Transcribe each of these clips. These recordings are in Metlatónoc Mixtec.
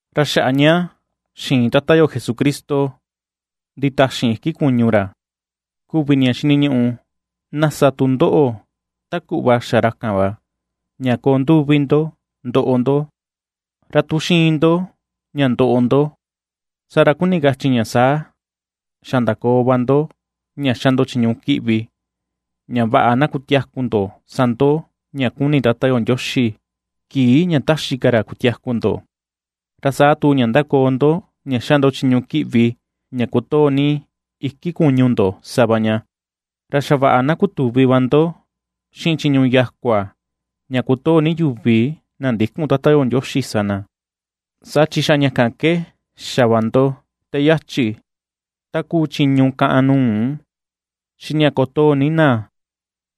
Ra xaꞌa ña xiin Tata yo Jesucristo nditaxin iki kuñu ra, kuvi ña xiniñuꞌu na sa tu ndoꞌo ta kuꞌva xa ra kan va, ña koo nduvi ndo ndoꞌo ndo. Ra tu xiin ndo ña ndoꞌo ndo, saa ra kuni kachi ña saa xa ndakoo va ndo ña xa ndo chiñu kiꞌvi, ña vaꞌa na kutiaku ndo sa ndo ña kuni Tata yo Ndioxi kii ña taxi ka ra kutiaku ndo, ra saa tu ña ndakoo ndo ña xa ndo chiñu kiꞌvi ña kotoo ni iki kuñu ndo sa va ña. Ra xa vaꞌa na kutuvi va ndo, xiꞌin chiñu yakua ña kotoo ni yuvi na ndïkun Tata yo Ndioxi sa na, saa chi xa ña kan ke xa va ndo te yachi: ta kuu chiñu káꞌán nuu, xiꞌin ña kotoo ni na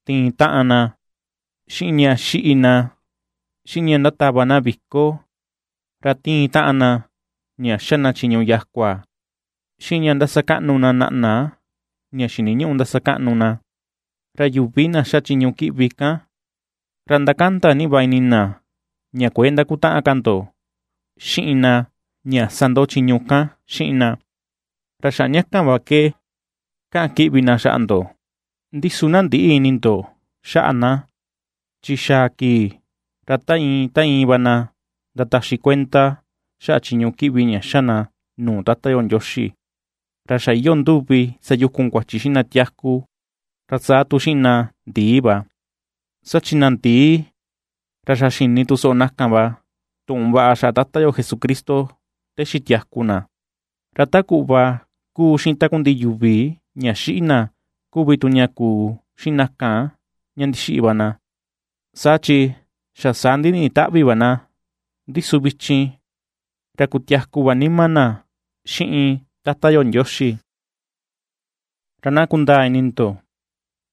tiin taꞌan na, xiꞌin ña xiꞌi na, xiꞌin ña ndatava na viko, ra tiin taꞌan na ña xa na chiñu yakua, xiꞌin ña ndasakaꞌnu na naꞌna ña xiniñüꞌu ndasakaꞌnu na. Ra yuvi na ^xa chiñu kiꞌvi kan, ra ndakanda ni va ini na ña kuëe ndakutaꞌan ka ndo xiꞌin na ña sa ndo ña chiñu kan xiꞌin na, ra xaꞌa ña kan va ke kaꞌan kiꞌvi na xaꞌa ndo. Ndi su na ndïꞌi ini ndo xaꞌa na, chi xaa kii, ra ta iin, ta iin va na ndataxi kuenda xaꞌa chiñu kiꞌvi ña xa na nuu Tata yo Ndioxi, ra xa iyoo nduvi sayukun kuachi xiꞌin na tiaku, ra saa tu xiꞌin na ndiꞌi va. Saa chi na ndii, ra xa xini tu soꞌo na kan va tuꞌun vaꞌa xaꞌa Tata yo Jesucristo te xitiaku na, ra ta kuꞌva ^kuu xiꞌin takundiꞌi yuvi ña xiꞌi na kuvi tu ña kuu xiꞌin na kan ña ndixiꞌi va na, saa chi xa saa ndiniꞌi taꞌvi va na, ndi su vichin, ra kutiaku va nima na xiꞌin Tata yo Ndioxi. Ra na kundaa ini ndo,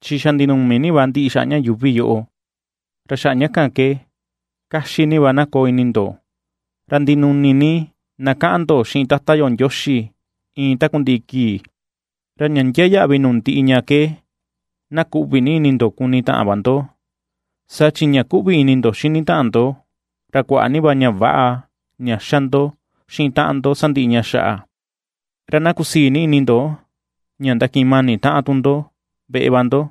chi xa ndinumi ni va ndiꞌi xaꞌa ña yuuvi yoꞌo, ra xaꞌa ña kan ke kaxi ni va na koo ini ndo, ra ndinuni ni na kaꞌan ndo xiꞌin Tata yo Ndioxi iin takundiꞌi kii. Ra ña ndiaa yaꞌvi nuu ndiꞌi ña ke na kuꞌvi ni ini ndo kuni taꞌan va ndo, saa chi ña kuꞌvi ini ndo xini taꞌan ndo, ra kuaꞌa ni va ña väꞌa ña ^xa ndo xiꞌin taꞌan ndo sandiꞌi ña xaꞌa. Ra na kusii ni ini ndo ña ndakiꞌin mani taꞌan tu ndo veꞌe va ndo,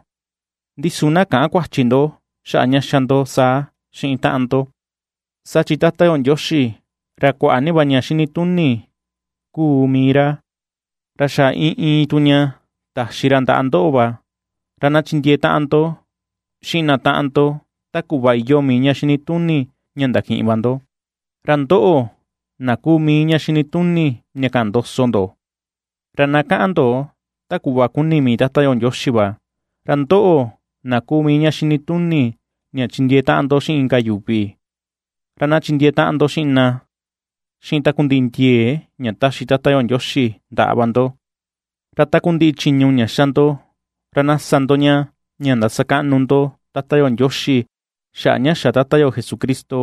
ndi su na käꞌan kuachi ndo xaꞌa ña ^xa ndo saa xiꞌin taꞌan ndo. Saa chi Tata yo Ndioxi, ra kuaꞌa ni va ña xinituni kuu mii ra, ra xa iin iin tu ña taxi ra ndaꞌa ndoꞌo va, ra na chindiee taꞌan ndo xiꞌin na taꞌan ndo ta kuꞌva iyoo mii ña xinituni ña ndakiꞌin va ndo. Ra ndoꞌo na kuu mii ña xinituni ña kaꞌan ndoso ndo, ra na kaꞌan ndo ta kuꞌva kuni mii Tata yo Ndioxi va. Ra ndoꞌo na kuu mii ña xinituni ña chindiee taꞌan ndo xiꞌin inka yuvi, ra na chindiee taꞌan ndo xiꞌin na xiꞌin takundiꞌi ndiee ña taxi Tata yo Ndioxi ndaꞌa va ndo. Ra takundiꞌi chiñu ña xa ndo, ra na sa ndo ña, ña ndasakaꞌnu ndo Tata yo Ndioxi xaꞌa ña xa Tata yo Jesucristo,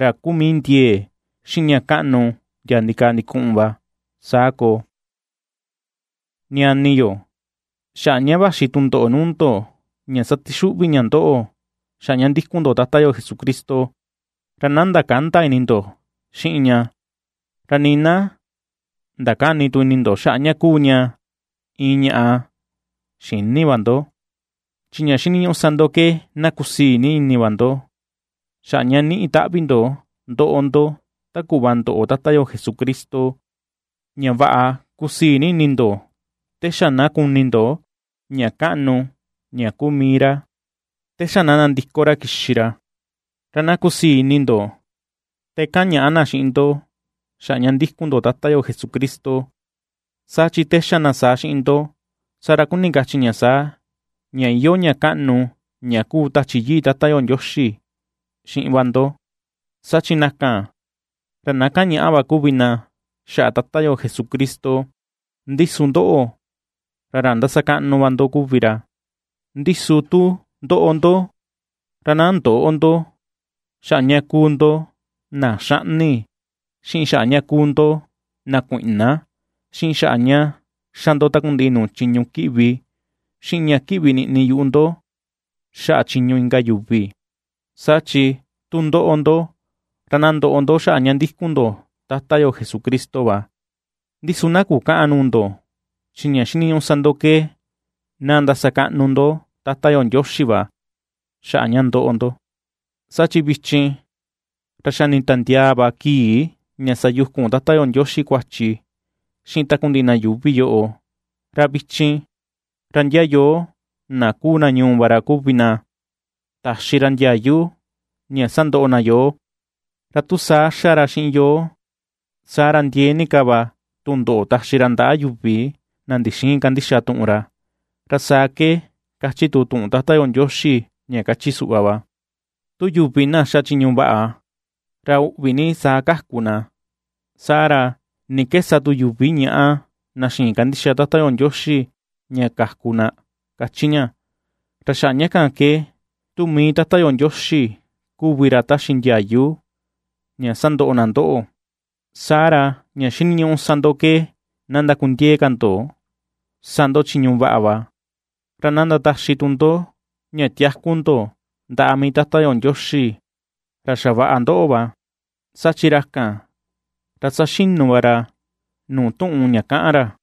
ra kuu mii ndiee, xiꞌin ña kaꞌnu ndia ndikaa ndikuꞌun va. Saa koo. Ñani yo, xaꞌa ña vaxi tundoꞌo nuu ndo ña satixuꞌvi ña ndoꞌo xaꞌa ña ndikun ndo Tata yo Jesucristo, ra na ndakända ini ndo xiꞌin ña, ra nii na ndakäni tu ini ndo xaꞌa ña kuu ña iin ñaꞌa xïni va ndo. Chi ña xiniñuꞌu sa ndo ke na kusii ni ini va ndo, xaꞌa ña niꞌi taꞌvi ndo ndoꞌo ndo ta kuꞌva ndoꞌo Tata yo Jesucristo, ña vaꞌa kusii ni ini ndo te xa na kuni ndo ña kaꞌnu ña kuu mii ra, te xa na nandiko ra kixi ra. Ra na kusii ini ndo, te kaꞌan ñaꞌa na xiꞌin ndo xaꞌa ña ndikun ndo Tata yo Jesucristo, saa chi te xa na saa xiꞌin ndo, saa ra kuni kachi ña saa, ña iyoo ña kaꞌnu ña kuu Tachi Yii Tata yo Ndioxi xiꞌin va ndo. Saa chi na kan, ra na kaꞌan ñaꞌa va kuvi na xaꞌa Tata yo Jesucristo, ndi su ndoꞌo, ra ra ndasakaꞌnu va ndo kuvi ra. Ndi su tu ndoꞌo ndo, ra na ndöꞌo ndo xaꞌa ña kuu ndo na xaꞌni, xiꞌin xaꞌa ña kuu ndo na kuiꞌna, xiꞌin xaꞌa ña xa ndo takundiꞌi nuu chiñu kiꞌvi, xiꞌin ña kiꞌvi niꞌni yuꞌu ndo xaꞌa chiñu inka yuvi. Saa chi tu ndoꞌo ndo, ra na ndoꞌo ndo xaꞌa ña ndikun ndo Tata yo Jesucristo va, ndi su na kukäꞌan nuu ndo, chi ña xiniñuꞌu sa ndo ke na ndasakaꞌnu ndo Tata yo Ndioxi va xaꞌa ña ndoꞌo ndo. Saa chi vichin, ra xa nitandiaa va kii ña sayukun Tata yo Ndioxi kuachi xiꞌin takundiꞌi na yuuvi yoꞌo, ra vichin, ra ndia yoo na kuu na ñuu va ra kuvi na taxi ra ndiayu ña sandoꞌo na yoo, ra tu saa xa ra xiꞌin yoo, saa ra ndiee ni ka va tundoꞌo taxi ra ndaꞌa yuvi na ndixïin kandixa tuꞌun ra. Ra saa ke kachi tu tuꞌun Tata yo Ndioxi ña kachi suꞌva va: Tu yuvi na xa chiñu vaꞌa, ra uꞌvi ni saa kaku na saa ra, ¿ni ke sa tu yuvi ñaꞌa na na xïin kandixa Tata yo Ndioxi ña kaku na?, kachi ña. Ra xaꞌa ña kan ke, tu mii Tata yo Ndioxi kuvi ra taxi ndiayu ña sandoꞌo na ndoꞌo, saa ra ña xiniñuꞌu sa ndo ke na ndakundiee ka ndo sa ndo chiñu vaꞌa va, ra na ndataxi tu ndo ña tiaku ndo ndaꞌa mii Tata yo Ndioxi, ra xavaꞌa ndoꞌo va, saa chi ra kan, ra ^saxinu va ra nuu tuꞌun ña kaꞌan ra.